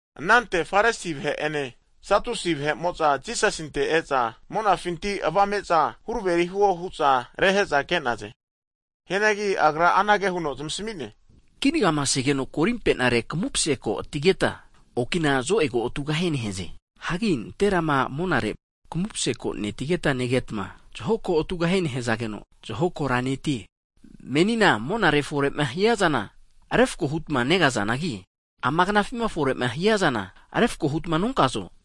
Anante Farisi vahe'ene Satusi vahe'mo'za Jisasinte e'za, monafinti avame'za huraveri huo hu'za rehe'za ke'naze. Hianagi Agra anage huno zamasami'ne, Kinagamasegeno korimpe'nare kamupaseko atigeta, okina zo'ego tugahie nehaze. Hagi nanterama monare kamupse ko netigeta negetma, zaho ko atugahie nehazageno, zaho kora netie. Menina monare fore'ma hiazana refako hutma negazanagi, ama knafima fore'ma hiazana refako hutma nonkazo?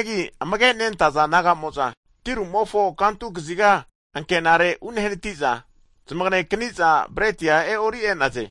Hagi amage nentaza disaipol naga'amo'za tirumofo kantu kaziga ankenare unehanati'za, zmage'akani'za breti e'ori' e'naze.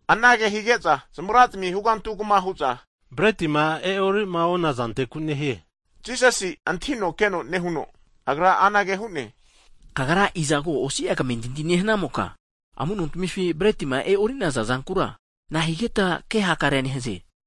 Anage hige'za, zamagra'zmi hugantu kama huza bretima e'orima onazanteku nehie hu'naze. Jisasi'a antahino keno nehuno, Agra anage hu'ne, Tamagra osi'a tamentinti nehaza vahe'mota, amu'notamifi bretima e'ori'naza zankura nahigeta ke hakare nehaze?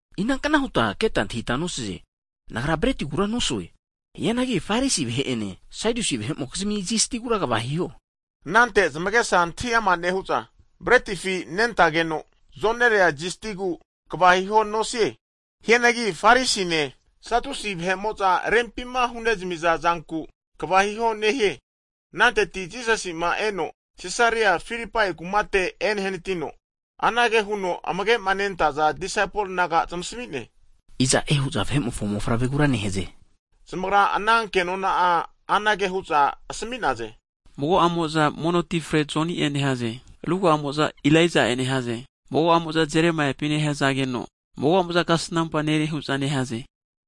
Inankna huta keta antahita nosaze, Nagra bretigura nosue? Hianagi Farisi vahe'ene Sadusi vahe'mokizmi zistigura kva hiho. Anante zamagesa antahi ama nehu'za, bretifi nentageno zonerea zistigu kva hiho nosie. Hianagi Farisine Sadusi vahe'mo'za rempima hunemiza zanku kva hiho nehie. Ananteti Jisasi'ma eno Sisaria Filipai kumate enehanatino, anage huno amage'ma nentaza disaipol naga zamantahige'ne, Iza'e hu'za Vahe'mofo mofavregura nehaze? Hige'za zamagra ana kenona anage hu'za asmi'naze, Mago'amo'za mono ti frezmante Joni'e nehaze, ruga'amo'za Elaija'e nehaze, mago'amo'za Jeremaiapi nehazageno, mago'amo'za hu'za mago kasnampa nere hu'za nehaze.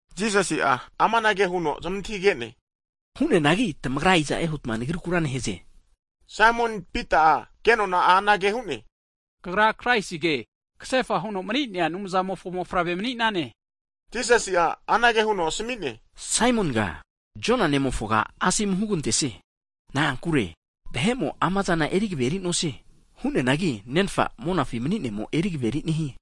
Jisasi'a amanage huno zamantahige'ne, Hu'neanagi tamagra iza'e, huta Nagrikura nehaze? Higeno Saimon Pita'a kenona'a anage hu'ne, Kagra Kraisige, kasefa huno mani'nea Anumzamofo mofavre mani'nane. Jisasi'a anage huno asmi'ne, Saimoniga, Jona nemofoga, Anumzamo'a asomu hugantesie. Na'ankure vahe'mo amazana erigaveri nosie. Hu'neanagi Nenfa monafi mani'nemo erigaveri nehie.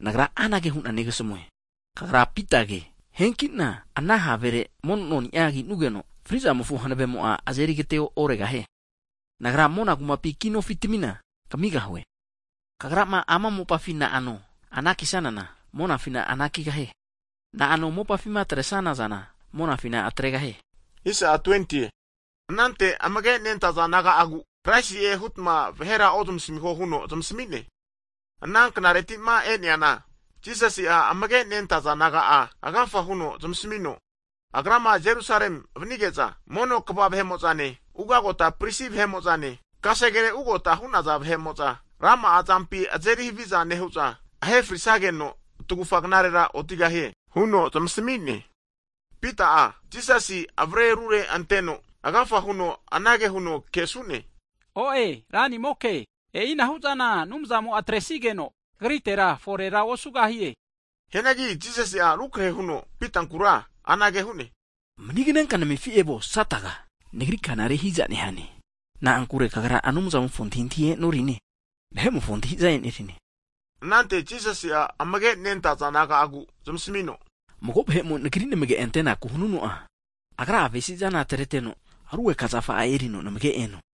Nagra anage hu'na negasamue, kagra Pitage, hanki'na ama ana havere, mono noni'a ki'nugeno, fri'zamofo hanavemo'a azeri agete'oregahie. Nagra mona kumapi kinofitmina kamigahue. Kagrama ama mopafima na'ano anakisanana, monafina anakigahie. Na'ano mopafi'ma atresana zana, monafina atregahie. Anante amage nentaza disaipol naga'agura, Kraisi'e hutma vahera ozmasmiho huno zamasmi'ne. Ana knareti'ma e'neana, Jisasi'a amage nentaza disaipol naga'a agafa huno zamasamino, Agrama Jerusalemi vanige'za, ugota mono kva (elda) vahe'mo'zane, ugagota pristi vahe'mo'zane, kasegere ugota hu'naza vahe'mo'za, rama'a zampi azeri haviza nehu'za ahe frisageno friteno tagufa knarera otigahie, huno zamasami'ne. Pita'a, Jisasina avare rure anteno, agafa huno anage huno kesu'ne, O'e Ranimoke! E'ina hu'zana Anumzamo'a atresigeno, Kagritera forera osugahie! Hianagi Jisasi'a rukrahe huno Pitankura anage hu'ne, Maniganenka namefi evuo Sataga! Nagri kana rehiza nehane. Na'ankure kagra Anumzamofo antahintahi e'norine, vahe'mofo antahi'za e'nerine. Anante Jisasi'a amage nentaza disaipol naga'a zmasamino, Mago vahe'mo Nagri namage antenaku hanuno'a, agra'a avesizana, atreteno rugeka zafa'a erino namage eno.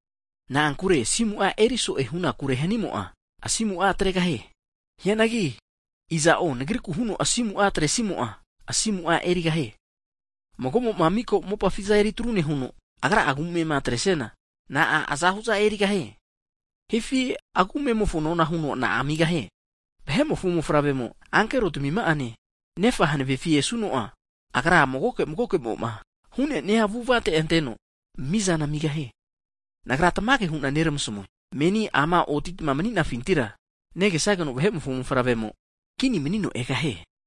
Na'ankure asimu'a aguvaziku hanimo'a, asimu'a atregahie. Hianagi iza'o Nagriku huno asimu'a atresimo'a asimu'a erigahie. Mago'mo mika mopafi zantami eri tru nehuno, agra'a agu amema atre'siana, na'a azahu'zana erigahie? Hifi agu amemofo nona huno na'a amigahie? Vahe'mofo mofavremo ankero tmima'ane, Nafa'amofo hanavefi esuno'a, Agra magoke magoke'moma hu'nenia avu'avate anteno mizana amigahie. Nagra tamage hu'na neramasmue, menima amama otitma mani'nafintira mago'amota ofri mani'netma negesageno Vahe'mofo mofavremo'a kini manino egahie.